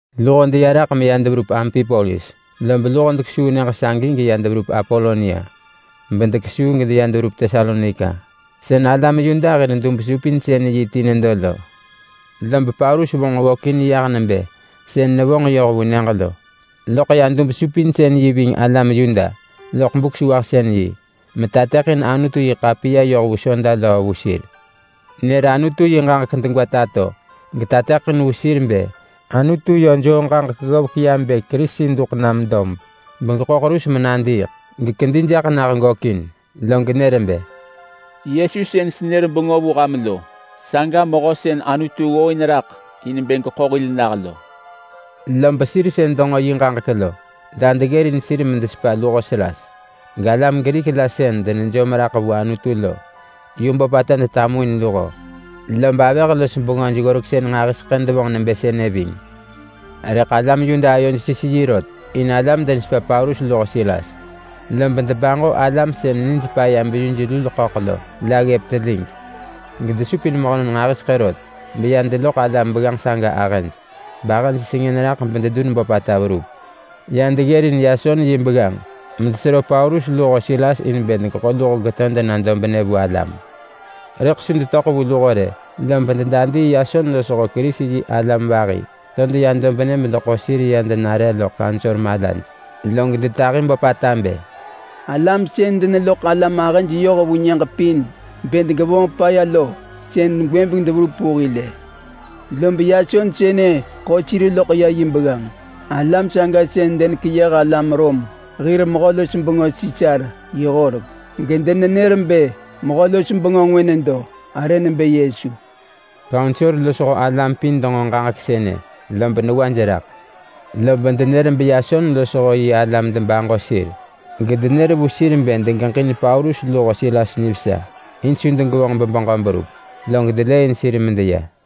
Luho deya raḳ meya deverup Ampipolis, lob luho dekesuu nyëġ sagi geya deverup Apolonia, bedekesuu geya deverup Tesalonika. Sën alam Yuda hir dub-supinsën-yi ti nedo lo. Lob Paulus vonġ ggökin yah nebë sën nevonġ yoh vu nyëġ lo. Loḳ ya dub-supinsën-yi ving alam Yuda loḳ Buk-sewahsën-yi metateḳin Anutu-yi-ḳapiya yoh vu soda löö vu sir. Nër Anutu yi ġaġek degwa tato getateḳin vu sir bë Anutu yö joo ġaġek ggovek ya bë Kerisi duḳ nam dob begeḳo ḳerus menadiiḳ, gekedi jaḳ nah gökin. Log nër bë, “Yesu sën senër bengö vu ham lo, saga Mehö sën Anutu ggooin raḳ in bë geḳo hil nah lo.” Lob sir sën denġo yi ġaġek lo la deggërin sir medesepa luho Silas. Galam Grik la sën denejom raḳ vu Anutu lo yu böpata detamuin luho. Lob avëh los bengöj-ggoreksën nġahiseḳë devonġ nebë sënë ving. Rëḳ alam Yuda ayoj sis yi rot in alam denesepa Paulus luho Silas, lob debaġo alam sën nijpaya beyuj-lul-ḳöḳ lo la ggëp telig, gedesupin mehönon nġahiseḳë rot beya deloḳ alam begganġ saga ahëj, bahëj sengën raḳ bededun böpata verup. Ya deggërin Yason yi begganġ medesero Paulus luho Silas in bë degeḳo luho geto dena dobnë vu alam. Rëḳ su detöḳ vu luho rë, lob dedadii Yason losho Kerisi-yi-alam vahi to deya dobnë bedeḳo sir ya denare loḳ kaunsor malaj, log detahi böpata bë, “Alam sën deneloḳ alam ahëj yoh vu nyëġ pin bë degevonġ paya lo, sën gwëbeng deverup vu hil-ë. Lob Yason sënë ḳo sir loḳ ya yi begganġ. Alam saga sën denekeyëh alam Rom hir mehö-los-bengö Sisar yi horek, gedenenër bë mehö-los-bengö ngwë nedo arë nebë Yesu.” Kaunsor losho alam pin denġo ġaġek sënë lob newaj raḳ. Lob denër beYason losho yi alam debaġo sir, gedenër vu sir bë degeġin Paulus luho Silas nivesa in su degevonġ bebeġö berup. Log delëëin sir medeya.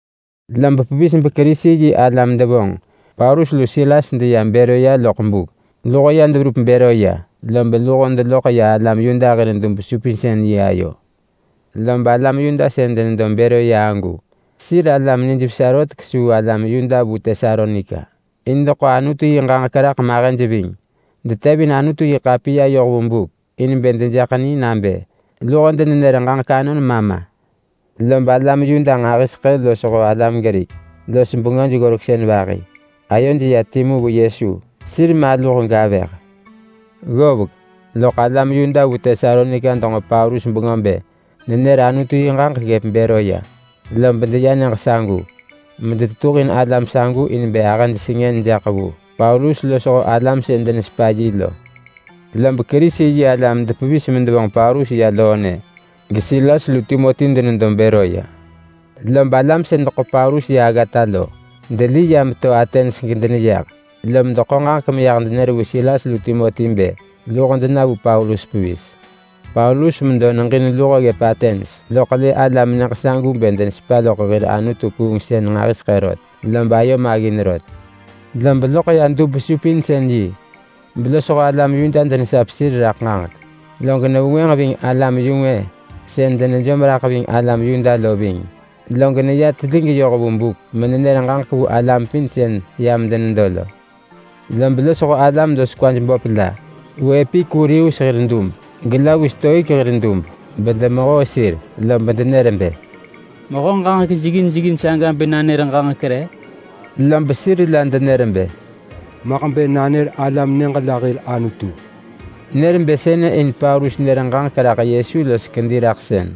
Loḳ pevis beKerisi-yi-alam devonġ Paulus lu Silas deya Beroya loḳ buk. Luho ya deverup Beroya, lob luho deloḳ ya alam Yuda hir dub-supinsën-yi ayo. Lob alam Yuda sën denedo Beroya agu sir alam nijvesa rot kesuu alam Yuda vu Tesalonika. In deḳo Anutu yi ġaġek raḳ mahëj ving. Detevin Anutu-yi-ḳapiya yoh vu buk in bë dejaḳ ni nabë luho denenër ġaġek anon ma ma. Lob alam Yuda nġahiseḳë losho alam Grik los bengöj-ggoreksën vahi ayoj ya timu vu Yesu. Sir maluh gavëh. Ggovek loḳ alam Yuda vu Tesalonika denġo Paulus bengö bë nenër Anutu yi ġaġek ggëp Beroya. Lob deya nyëġ sagu, medetetuhin alam sagu in bë ahëj sengën jaḳ vu Paulus losho alam sën denesepa yi lo. Lob Kerisi-yi-alam depevis medevonġ Paulus ya loonë, geSilas lu Timoti denedo Beroya. Lob alam sën deḳo Paulus ya aggata lo deli ya meto Atens gedeneyah, lom deḳo ġaġek meyah denër vu Silas lu Timoti bë luho dena vu Paulus pevis. Paulus medo neġin luho ggëp Atens, loḳ lë alam nyëġ sagu bë denesepa loḳ hir anutu-kuungsën nġahiseḳë rot, lob ayo maggin rot. Lob loḳ ya dub-supinsën-yi belosho alam Yuda denesap sir raḳ ġaġek. Log nevengwënġ ving alam-yu-ngwë sën denejom raḳ ving alam Yuda lo ving. Log neya telig yoh vu buk menenër ġaġek vu alam pin sën yam denedo lo. Lob losho alam los kwaj böp la vu Epikurius hir dub, gela vu Stoik hir dub bedemehoo sir, lob denër bë, “Mehö ġaġek jeggin jeggin saga bë nanër ġaġek re?” Lob sir la denër bë, “Maḳ bë nanër alam nyëġ la hir anutu!” Nër bë sënë in Paulus nër ġaġek raḳ Yesu los kediraḳsën.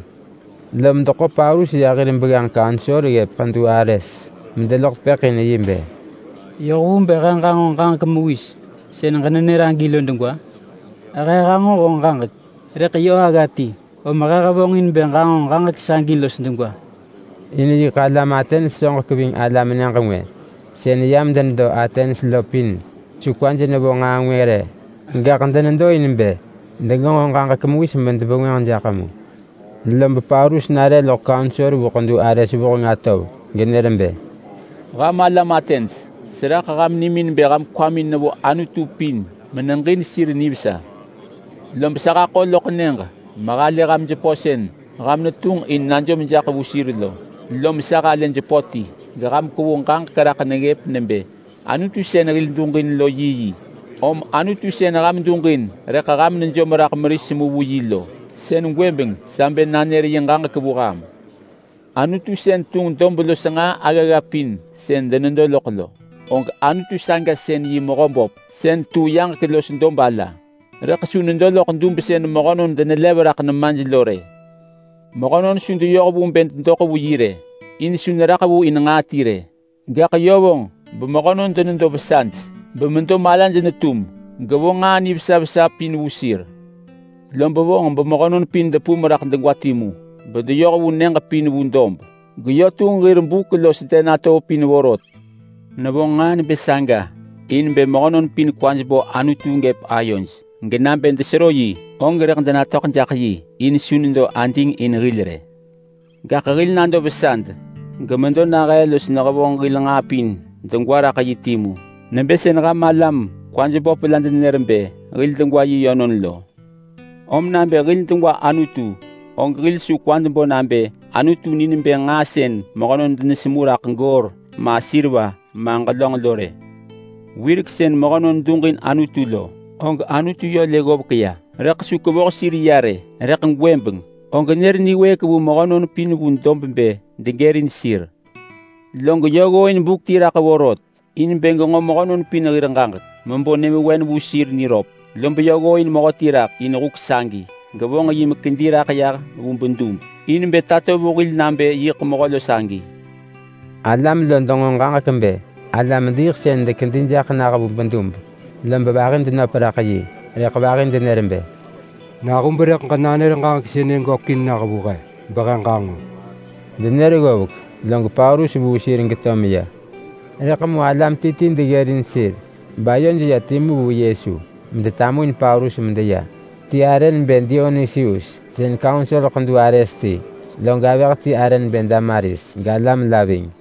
Lom deḳo Paulus ya hir begganġ kaunsor ggëp Ḳedu Ares medeloḳ tepëḳ in yi bë, “Yoh vu bë he ġanġo ġaġek mewis sën ġenenër agi lo degwa? He hanġo honġ ġaġek rëḳ yö agga ti, om he hevonġin bë ġanġo ġaġek sagi los degwa!” In yiḳ alam Atens soġek ving alam nyëġ ngwë sën yam denedo Atens lo pin su kwaj nevo nġaa ngwë rë. Gaḳ denedo in bë degenġo ġaġek mewis medebengwënġ jaḳ mu. Lob Paulus nare loḳ kaunsor vu Ḳedu Ares vuheng atov genër bë, “Ham alam Atens! Seraḳ ham nimin bë ham kwamin vo anutu pin meneġin sir nivesa. Lob sa haḳo loḳ nyëġ mehalë ham jepö sën ham netunġ in bë ham najom jaḳ vu sir lo. Lom sa halë jepö ti geham kwevu ġaġek raḳ neggëp nebë ‘Anutu sën hil duġin lo yiyi’. Om anutu sën ham duġin rëḳ ham nejom raḳ meris mu vu yi lo, sën gwëbeng sa bë nanër yi ġaġek vu ham. Anutu sën tunġ dob los nġaa aggagga pin sën denedo loḳ lo, og Anutu saga sën yi Mehöböp sën tu yaġek los dob ala. Rëḳ su nedo loḳ dub sën mehönon denelev raḳ nemaj lo rë. Mehönon su deyoh vu bë dedoḳ vu yi rë, in su neraḳ vu in nġaa ti rë. Gaḳ yö vonġ bemehönon denedo vesaj bemedo malaj netum, gevo nġaa nivesa vesa pin vu sir. Lob vonġ bemehönon pin depum raḳ degwa timu bedeyoh vu nyëġ pin vu dob, geyö tunġ hir buk los den atov pin vorot. Nevonġ nġaa nebë saga in bë mehönon pin kwaj bo Anutu gëp ayoj. Genabë desero yi, og rëḳ denatöḳ jaḳ yi, in su nedo ading in hil rë. Gaḳ hil nado vesad gemedo nahee los nehevonġ hil nġaa pin degwa raḳ yi timu. Nebë sën ham alam kwaj böp la denenër bë, ‘Hil degwa yi yönon!’ lo. Om nabë hil degwa Anutu, og hil su kwad bo nabë Anutu ni nebë nġaa sën mehönon denesemu raḳ goor ma seriva ma ġelönġ lo rë. Wirek sën mehönon duġin Anutu lo, og Anutu yö lë ggovek ya rëḳ su kevoh sir ya rë. Rëḳ gwëbeng og nër niwëëk vu mehönon pin vu dob bë degërin sir. Log yö ggooin buk ti raḳ vorot in bë genġo mehönon pin hir ġaġek mebo nyëvewen vu sir niröp. Lob yö ggooin mehöti raḳ in huk sagi, gevonġ yi mekedi raḳ yah vu bedub in bë tato vu hil nabë yiḳ mehö lo sagi.” Alam lo denġo ġaġek bë alam-diiḳsën dekedi jaḳ nah vu bedub, lob vahi denöp raḳ yi, rëḳ vahi denër bë, “Nahub rëḳ ġenanër ġaġek sënë gökin nah vu he behe ġanġo!” Denër ggovek log Paulus vuu sir geto meya. Rëḳ mu alam ti ti deggërin sir bayoj ya timu vu Yesu medetamuin Paulus medeya. Ti arë nebë Dionusius sën kaunsor Ḳedu Ares ti, log avëh ti arë nebë Damaris, galam la ving.